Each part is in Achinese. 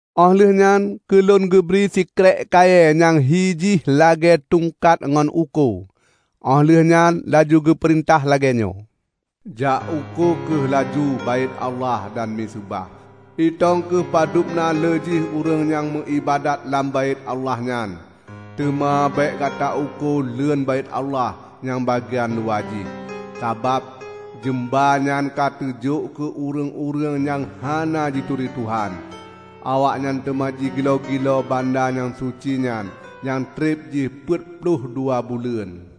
Óh lheueh nyan keulôn geubri sikrék kayée nyang hi jih lagée tungkat ngon uko, óh lheueh nyan laju geupeurintah lagée nyoe, "Jak uko kheueh laju Baét Allah dan miseubah. Itong kheueh padub na lé jih ureuëng nyang meuiébadat lam Baét Allah nyan. Teuma bék gata uko leuen Baét Allah nyang bagian luwa jih, sabab jeumba nyan ka teujok keu ureuëng-ureuëng nyang hana jituri Tuhan. Awaknyan teuma jigiloe-giloe banda nyang suci nyan nyang treb jih peuet ploh dua buleuen.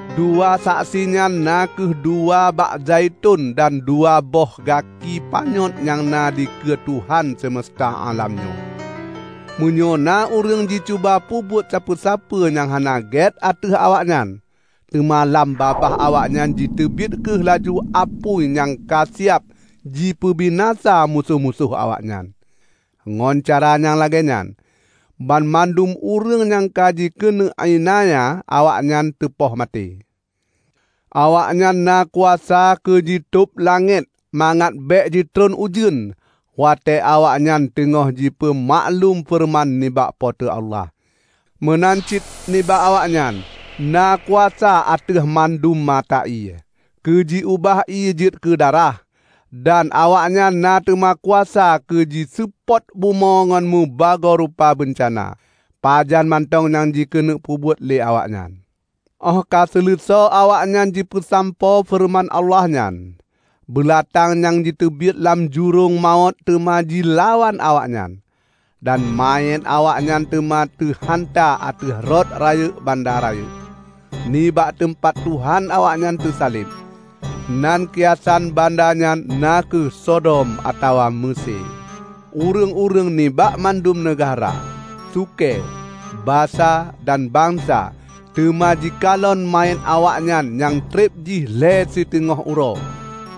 Dua saksi nyan na kheueh dua bak zaiton dan dua boh gaki panyöt nyang na dikeue Tuhan semeusta álam nyoe. Meunyoe na ureuëng jicuba peubuet sapeue-sapeue nyang hana gét ateueh awaknyan, teuma lam babah awaknyan jiteubiet kheueh laju apui nyang ka siab jipeubinasa musoh-musoh awaknyan. Ngon cara nyang lagée nyan, banmandum ureuëng nyang jikeuneuk iélanya awaknyan teupoh maté. Awaknyan na kuasa keu jitôb langét mangat bék jitreun ujeuen watée awaknyan teungoh jipeumaklum feureuman nibak Po teu Allah. Meunan cit nibak awaknyan na kuasa ateueh mandum mata ié, keu ji-ubah ié jeuet keu darah. Dan awaknyan na teuma kuasa keu jiseupôt bumoe ngon meubagoe rupa beuncana, pajan mantong nyang jikeuneuk peubuet lé awaknyan. Óh ka seuleusoe awaknyan jipeusampoe feureuman Allah nyan, beulatang nyang jiteubiet lam jurông mawöt teuma jilawan awaknyan. Dan manyét awaknyan teuma teuhanta ateueh rot rayeuk banda rayeuk, nibak teumpat Tuhan awaknyan teusaleb. Nan kiasan banda nyan na kheueh Sodom atawa Meusé. Ureuëng-ureuëng nibak mandum neugahra, sukée, basa, dan bansa teuma jikalon manyét awaknyan nyang treb jih lhée siteungoh uroe,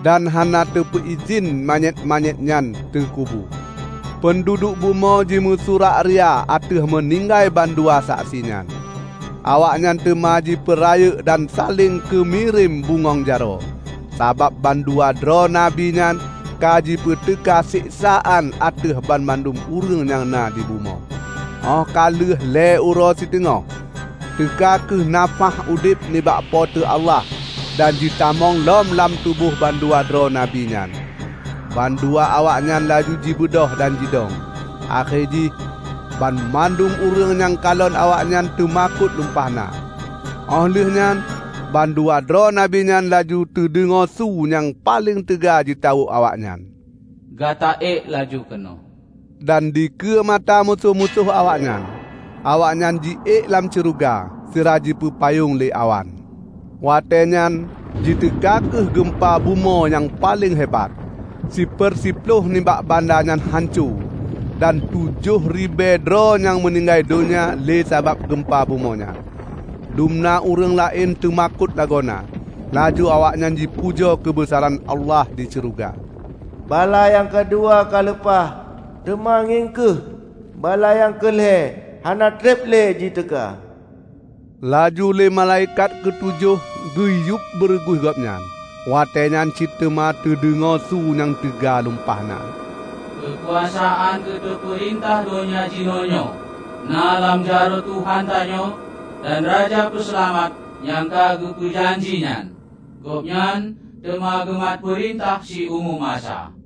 dan hana teupeuidhin manyét-manyét nyan teukubu. Peunduduek bumoe jimeusurak ria ateueh meuninggai bandua saksi nyan. Awaknyan teuma jipeurayeuk dan saléng keumirém bungöng jaroe, sabab bandua droe nabi nyan ka jipeuteuka seksaan ateueh banmandum ureuëng nyang na di bumoe. Óh ka lheueh lhée uroe siteungoh, teuka kheueh nafáh udeb nibak Po teu Allah dan jitamong lom lam tuboh bandua droe nabi nyan. Bandua awaknyan laju jibeudôh dan jidong, akhé jih, banmandum ureuëng nyang kalon awaknyan teumakot lumpah na. Óh lheueh nyan bandua droe nabi nyan laju teudeungoe su nyang paleng teuga jitawök awaknyan, "Gata ék laju keunoe!" Dan dikeue mata musoh-musoh awaknyan, awaknyan ji ék lam syeuruga, sira jipeupayong lé awan. Watée nyan jiteuka kheueh geumpa bumoe nyang paleng hebat. Siper siploh nibak banda nyan hanco, dan na tujoh ribée droe nyang meuninggai donya lé sabab geumpa bumoe nyan. Dumna ureuëng laén teumakot lagoena, laju awaknyan jipujoe keubeusaran Allah di syeuruga. Bala nyang keudua ka leupah. Teuma ngieng kheueh! Bala nyang keu lhée hana treb lé jiteuka. Laju lé malaikat keutujoh geuyueb beureuguih gobnyan, watée nyan cit teuma teudeungoe su nyang teuga lumpah na, "Keukuasaan keuteupeurintah donya jinoenyoe na lam jaroe Tuhan tanyoe dan Raja Peuseulamat nyang ka geupeu janji nyan. Gobnyan teuma geumat peurintah siumu masa!"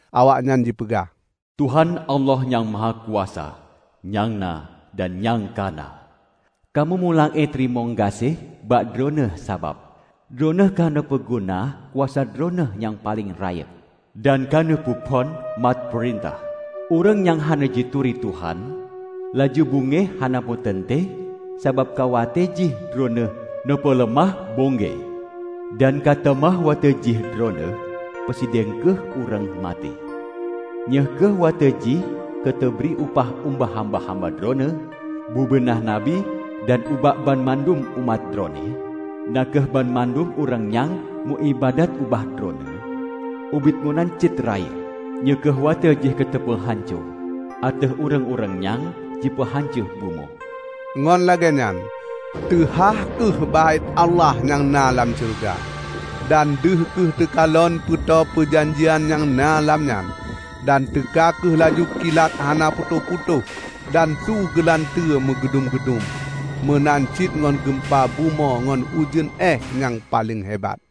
Awaknyan jipeugah, "Tuhan, Allah Nyang Mahakuasa, nyang na, dan nyang ka na! Kamoe meulakée teurimong gaséh bak Droeneueh sabab Droeneueh ka neupeuguna kuasa Droeneueh nyang paleng rayeuk, dan ka neupeuphon mat peurintah! Ureuëng nyang hana jituri Tuhan, laju beungéh hana meuteuntée sabab ka watée jih Droeneueh neupeuleumah beungéh, dan ka teuma watée jih Droeneueh peusidang keu ureuëng maté. Nyoe kheueh watée jih keuteubri upah ubak hamba-hamba Droeneueh, bubena nabi, dan ubak banmandum umat Droeneueh, na kheueh banmandum ureuëng nyang meuiébadat ubak Droeneueh, ubit meunan cit rayeuk. Nyoe kheueh watée jih keuteupeu hanco ateueh ureuëng-ureuëng nyang jipeuhanco bumoe!" Ngon lagée nyan teuhah kheueh Baét Allah nyang na lam syeuruga, dan deuh kheueh teukalon Peuto Peujanjian nyang na lam nyan. Dan teuka kheueh laju kilat hana putôh-putôh dan su geulanteue meugudum-geudum, meunan cit ngon gumpa bumoe ngon ujeuen éeh nyang paleng hebat.